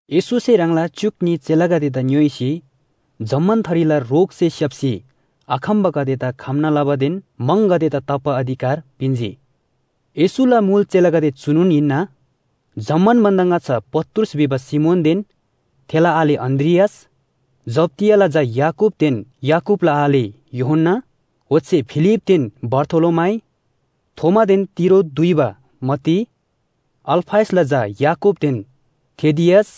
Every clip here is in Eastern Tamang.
येशूसे ह्राङला च्‍युक न्‍ही चेलागदेदा ङ्‌योइसी जम्‍मान थरीला रोगसे स्‍याप्‍सी आखम्‍बागदेदा खम्‍ना लबादेन म्‍हङगदेदा ताप्‍बा अधिकार पिन्‍जी। येशूला मुल चेलागदे चुनोन हिन्‍ना, जम्‍मान भन्‍दा ङाच्‍छा पत्रुस भिबा सिमोनदेन थेला आले अन्‍द्रियास, जब्‍दियाला झा याकूबदेन याकूबला आले यूहन्‍ना, ओच्‍छे फिलिपदेन बारथोलोमाइ, थोमादेन तिरो दुइबा मत्ती, अल्‍फयसला झा याकूबदेन थेदियस,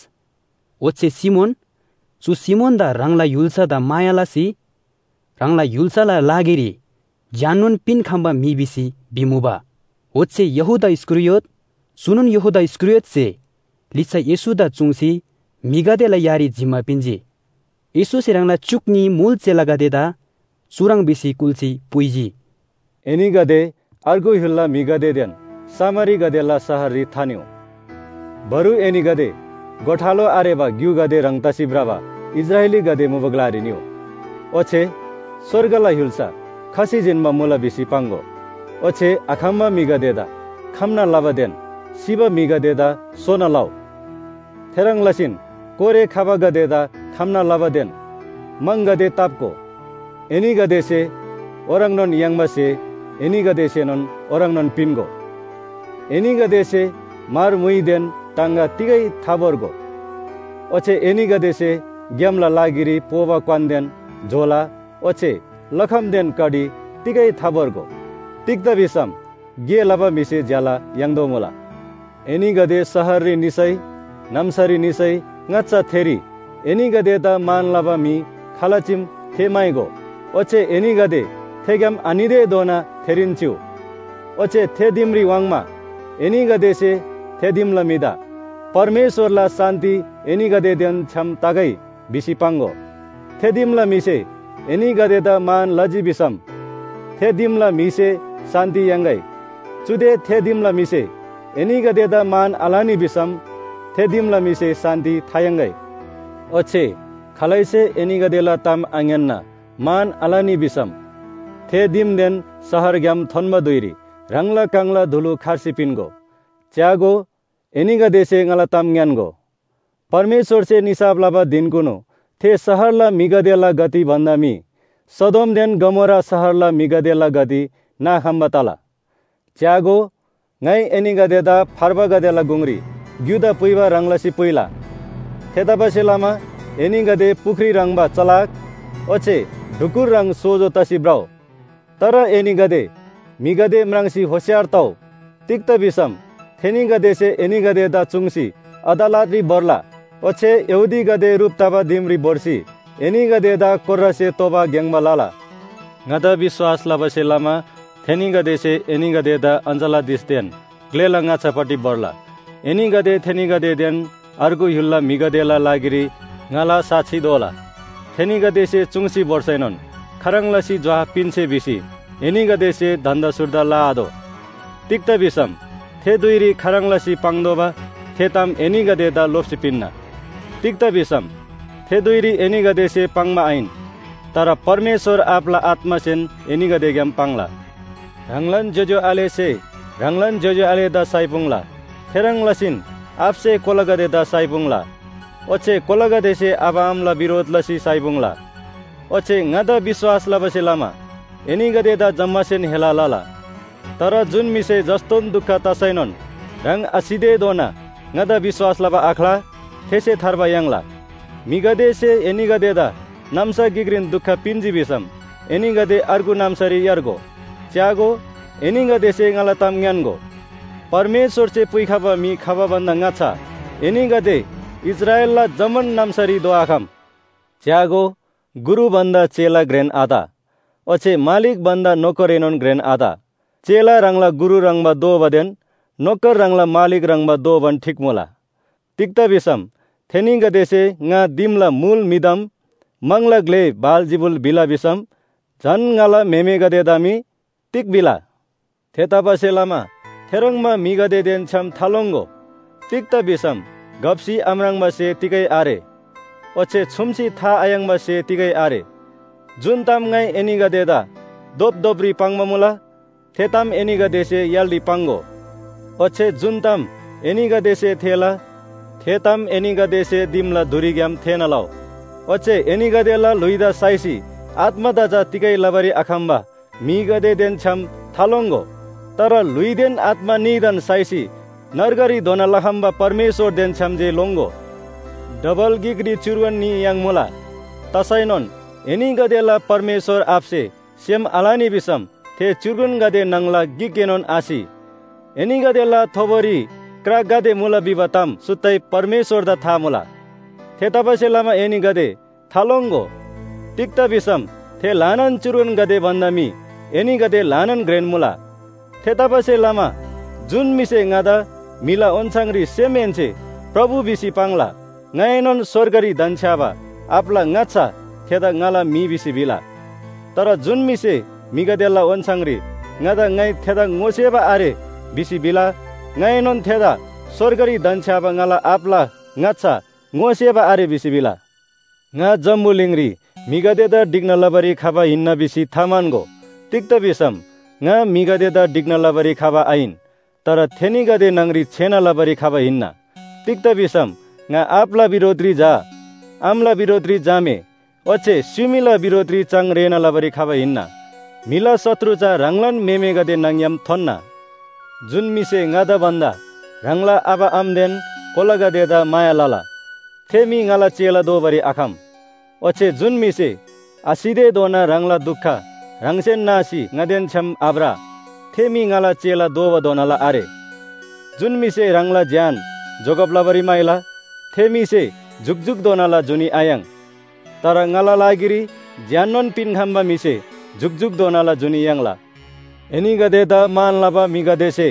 ओच्‍छे सिमोन चु सिमोनदा ह्राङला य्‍हुल्‍सादा माया लसी ह्राङला य्‍हुल्‍साला लागिरी ज्‍याननोन पिन्‍खम्‍बा म्‍हि भिसी भिमुबा। ओच्‍छे यहूदा इस्‍करियोत, चुनोन यहूदा इस्‍करियोतसे लिच्‍छा येशूदा चुङ्सी म्‍हिगदेला यारी जिम्‍मा पिन्‍जी। येशूसे ह्राङला च्‍युक न्‍ही मुल चेलागदेदा चुह्रङ् भिसी कुल्‍सी पुइजी, “एनीगदे अर्गु य्‍हुलला म्‍हिगदेदेन सामरीगदेला शहररी थानिउ। बरु एनीगदे गोठालो आरेबा ग्‍युगदे ह्रङ् तसी भ्रबा इस्राएलीगदे मुबा ग्‍लारी निउ। ओच्‍छे ‘स्‍वर्गला य्‍हुल्‍सा खसी जिन्‍बा मुला’ भिसी पाङ्‍गो। ओच्‍छे आखम्‍बा म्‍हिगदेदा खम्‍ना लबादेन सिबा म्‍हिगदेदा सोना लउ। थेह्रङ् लसीन कोरे खबागदेदा खम्‍ना लबादेन म्‍हङगदे ताप्‍गो। एनीगदेसे ओह्रङ्नोन याङ्बा स्‍हे एनीगदेसेएनोन ओह्रङ्नोन पिन्‍गो। एनीगदेसे म्‍हर म्‍हुइदेन टाङगा तिगै थाभोर्गो। ओच्‍छे एनीगदेसे ग्‍यामला लागिरी पोबा क्‍वानदेन झोला ओच्‍छे लखमदेन कडी तिगै थाभोर्गो। तिग्‍दा भिसम गे लबा म्‍हिसे ज्‍याला याङ्तोःमुला। “एनीगदे शहररी निसै नाम्‍सारी निसै ङाच्‍छा थेरी एनीगदेदा मान लबा म्‍हि खाल चीम थे म्‍हाइगो। ओच्‍छे एनीगदे थेग्‍याम आनितेधोना थेरीन चिउ। ओच्‍छे थे दिमरी वाङ्मा एनीगदेसे थे दिमला म्‍हिदा “परमेश्‍वरला शान्‍ति एनीगदेदेन छ्‌याम तगै” भिसी पाङ्‍गो। थे दिमला म्‍हिसे एनीगदेदा मान लजी भिसम थे दिमला म्‍हिसे शान्‍ति याङ्‌गै। चुदे थे दिमला म्‍हिसे एनीगदेदा मान आलनी भिसम थे दिमला म्‍हिसे शान्‍ति थायाङ्‍गै। ओच्‍छे खालैसे एनीगदेला ताम आङ्‌यान्‍ना मान आलनी भिसम थे दिमदेन शहरग्‍याम थोन्‍बा धुइरी ह्राङला काङला धुलु खर्सी पिन्‍गो। च्‍यागो, एनीगदेसे ङाला ताम ङ्‌यान्‍गो, परमेश्‍वरसे निसाफ लबा धिनकुनु थे शहरला म्‍हिगदेला गति भन्‍दा मी सदोमदेन गमोरा शहरला म्‍हिगदेला गति नाखम्‍बा तला। “च्‍यागो, ङाइ एनीगदेदा फार्बागदेला गुङरी ग्‍युदा पुइबा ह्रङ् लसी पुइला। थेतबासेलमा एनीगदे पुख्री ह्रङ्‌बा चलाक ओच्‍छे ढुकुर ह्रङ् सोजो तसी भ्रउ। तर एनीगदे म्‍हिगदे म्राङ्सी होशियार तउ, तिग्‍दा भिसम थेनीगदेसे एनीगदेदा चुङ्सी अदालतरी भोर्ला। ओच्‍छे यहूदीगदे ह्रुप तबा दिमरी भोर्सी एनीगदेदा कोर्रासे तोबा ग्‍याङ्‍बा लला। ङादा विश्‍वास लबासे लमा थेनीगदेसे एनीगदेदा अञ्‍चलाधीशदेन ग्‍लेला ङाच्‍छापट्टि भोर्ला। एनीगदे थेनीगदेदेन अर्गु य्‍हुलला म्‍हिगदेला लागिरी ङाला साक्षी दोला। थेनीगदेसे चुङ्सी भोर्सैनोन खाह्रङ् लसी जोहाब पिन्‍से भिसी एनीगदेसे धन्‍दा सुर्दा लआतोः। तिग्‍दा भिसम थे धुइरी खाह्रङ् लसी पाङ्तोःबा थे ताम एनीगदेदा लोप्‍सी पिन्‍ना। तिग्‍दा भिसम थे धुइरी एनीगदेसे पाङ्बा आहिन, तर परमेश्‍वर आबाला आत्‍मासेन एनीगदेग्‍याम पाङ्ला। “ह्राङलान ज्‍योज्‍यो आलेसे ह्राङलान ज्‍योज्‍यो आलेदा साइपुङ्ला। थेह्रङ् लसीन आबासे कोलागदेदा साइपुङ्ला, ओच्‍छे कोलागदेसे आबा आमाला बिरोध लसी साइपुङ्ला। ओच्‍छे ङादा विश्‍वास लबासे लमा एनीगदेदा जम्‍मासेन हेला लला। तर जुन म्‍हिसे जस्‍तोन दुख तसैनोन ह्राङ आसितेधोना ङादा विश्‍वास लबा आख्‍ला थेसे थार्बा याङ्ला। म्‍हिगदेसे एनीगदेदा नाम्‍सा गिकरी दुख पिन्‍जी भिसम एनीगदे अर्गु नाम्‍सारी यार्गो। च्‍यागो, एनीगदेसे ङाला ताम ङ्‌यान्‍गो, परमेश्‍वरसे पुइखबा म्‍हि खबा भन्‍दा ङाच्‍छा एनीगदे इस्राएलला जम्‍मान नाम्‍सारी धोआखम। “च्‍यागो, गुरु भन्‍दा चेला घ्रेन आत, ओच्‍छे मालिक भन्‍दा नोकरएनोन घ्रेन आत। चेला ह्राङला गुरु ह्रङ्‌बा दोबादेन नोकर ह्राङला मालिक ह्रङ्‌बा दोबान ठीक मुला। तिग्‍दा भिसम थेनीगदेसे ङा दिमला मुल म्‍हिदाम म्‍हङला ग्‍ले बालजिबुल भिला भिसम झन ङाला म्‍हेमेगदेदा मी तिग भिला? “थेतबासेलमा थेह्रङ्बा म्‍हिगदेदेन छ्‌याम थालोङ्‍गो। तिग्‍दा भिसम घप्‍सी आम्राङ्बा स्‍हे तिगै आरे, ओच्‍छे छुम्‍सी था आयाङ्बा स्‍हे तिगै आरे। जुन ताम ङाइ एनीगदेदा धोपधोपरी पाङ्बा मुला, थे ताम एनीगदेसे य्‍हालरी पाङ्‍गो, ओच्‍छे जुन ताम एनीगदेसे थेःला, थे ताम एनीगदेसे दिमला धुरीग्‍याम थेःना लउ। ओच्‍छे एनीगदेला ल्‍हुइदा साइसी आत्‍मादा चा तिगै लबारी आखम्‍बा म्‍हिगदेदेन छ्‌याम थालोङ्‍गो। तर ल्‍हुइदेन आत्‍मा न्‍हीदान साइसी नर्गरी धोना लखम्‍बा परमेश्‍वरदेन छ्‌याम जे लोङ्‍गो। डबल गिकरी च्‍युर्गन न्‍ही याङ्मुला। तसैनोन एनीगदेला परमेश्‍वर आबासे सेम आलनी भिसम थे च्‍युर्गनगदे न्‍हङला गिकएनोन आसि। एनीगदेला थोबोरी क्रा गाते मुला भिबा ताम सुत्तै परमेश्‍वरदा था मुला। थेतबासेलमा एनीगदे थालोङ्‍गो। तिग्‍दा भिसम थे ल्‍हानान च्‍युर्गनगदे भन्‍दा मी एनीगदे ल्‍हानान घ्रेन मुला। “थेतबासेलमा जुन म्‍हिसे ङादा म्‍हिला ओन्‍छाङरी सेमहेन्‍से प्रभु भिसी पाङ्ला, ङाएनोन स्‍वर्गरी धन्‍छ्‌याबा आबाला ङाच्‍छा थेदा ङाला म्‍हि भिसी भिला। तर जुन म्‍हिसे म्‍हिगदेला ओन्‍छाङरी ङादा ङाइ थेदा ङोसेबा आरे भिसी भिला, ङाइएनोन थेदा स्‍वर्गरी धन्‍छ्‌याबा ङाला आबाला ङाच्‍छा ङोसेबा आरे भिसी भिला। “ङा जम्‍बुलिङरी म्‍हिगदेदा ढिक्‍ना लबारी खबा हिन्‍ना भिसी थाम्‍हन्‍गो। तिग्‍दा भिसम ङा म्‍हिगदेदा ढिक्‍ना लबारी आहिन, तर थेनीगदे न्‍हङरी छेना लबारी खबा हिन्‍ना। तिग्‍दा भिसम ‘ङा आबाला बिरोधरी झा, आमाला बिरोधरी झामे ओच्‍छे स्‍युमीला बिरोधरी चाङ रेःना लबारी खबा हिन्‍ना। म्‍हिला शत्रु चा ह्राङलान म्‍हेमेगदे न्‍हङ‍ग्‍याम थोन्‍ना।’ “जुन म्‍हिसे ङादा भन्‍दा ह्राङला आबा आमादेन कोलागदेदा माया लला, थे म्‍हि ङाला चेला दोबारी आखम। ओच्‍छे जुन म्‍हिसे आसितेधोना ह्राङला दुख ह्राङसेन नासी ङादेन छ्‌याम आभ्र, थे म्‍हि ङाला चेला दोबाधोनाला आरे। जुन म्‍हिसे ह्राङला ज्‍यान जोगब लबारी म्‍हाइला थे म्‍हिसे जुकजुकधोनाला जुनी आयाङ्। तर ङाला लागिरी ज्‍याननोन पिन्‍खम्‍बा म्‍हिसे जुकजुकधोनाला जुनी याङ्ला। “एनीगदेदा मान लबा म्‍हिगदेसे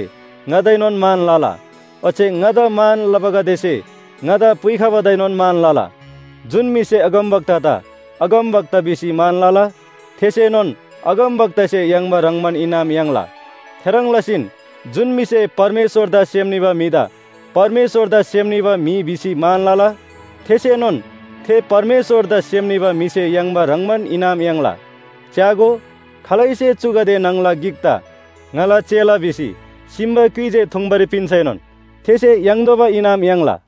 ङादाएनोन मान लला। ओच्‍छे ङादा मान लबागदेसे ङादा पुइखबादाएनोन मान लला। जुन म्‍हिसे अगमवक्तादा ‘अगमवक्ता’ भिसी मान लला, थेसेनोन अगमवक्तासे याङ्बा ह्रङ्‌बान इनाम याङ्ला। थेह्रङ् लसीन जुन म्‍हिसे परमेश्‍वरदा सेम निबा म्‍हिदा ‘परमेश्‍वरदा सेम निबा म्‍हि’ भिसी मान लला, थेसेनोन थे परमेश्‍वरदा सेम निबा म्‍हिसे याङ्बा ह्रङ्‌बान इनाम याङ्ला। च्‍यागो, खालैसे चुगदे न्‍हङला गिकदा ङाला चेला भिसी सिम्‍बा क्‍युइ जे थुङ्बारी पिन्‍सैनोन थेसे याङ्तोःबा इनाम याङ्ला।”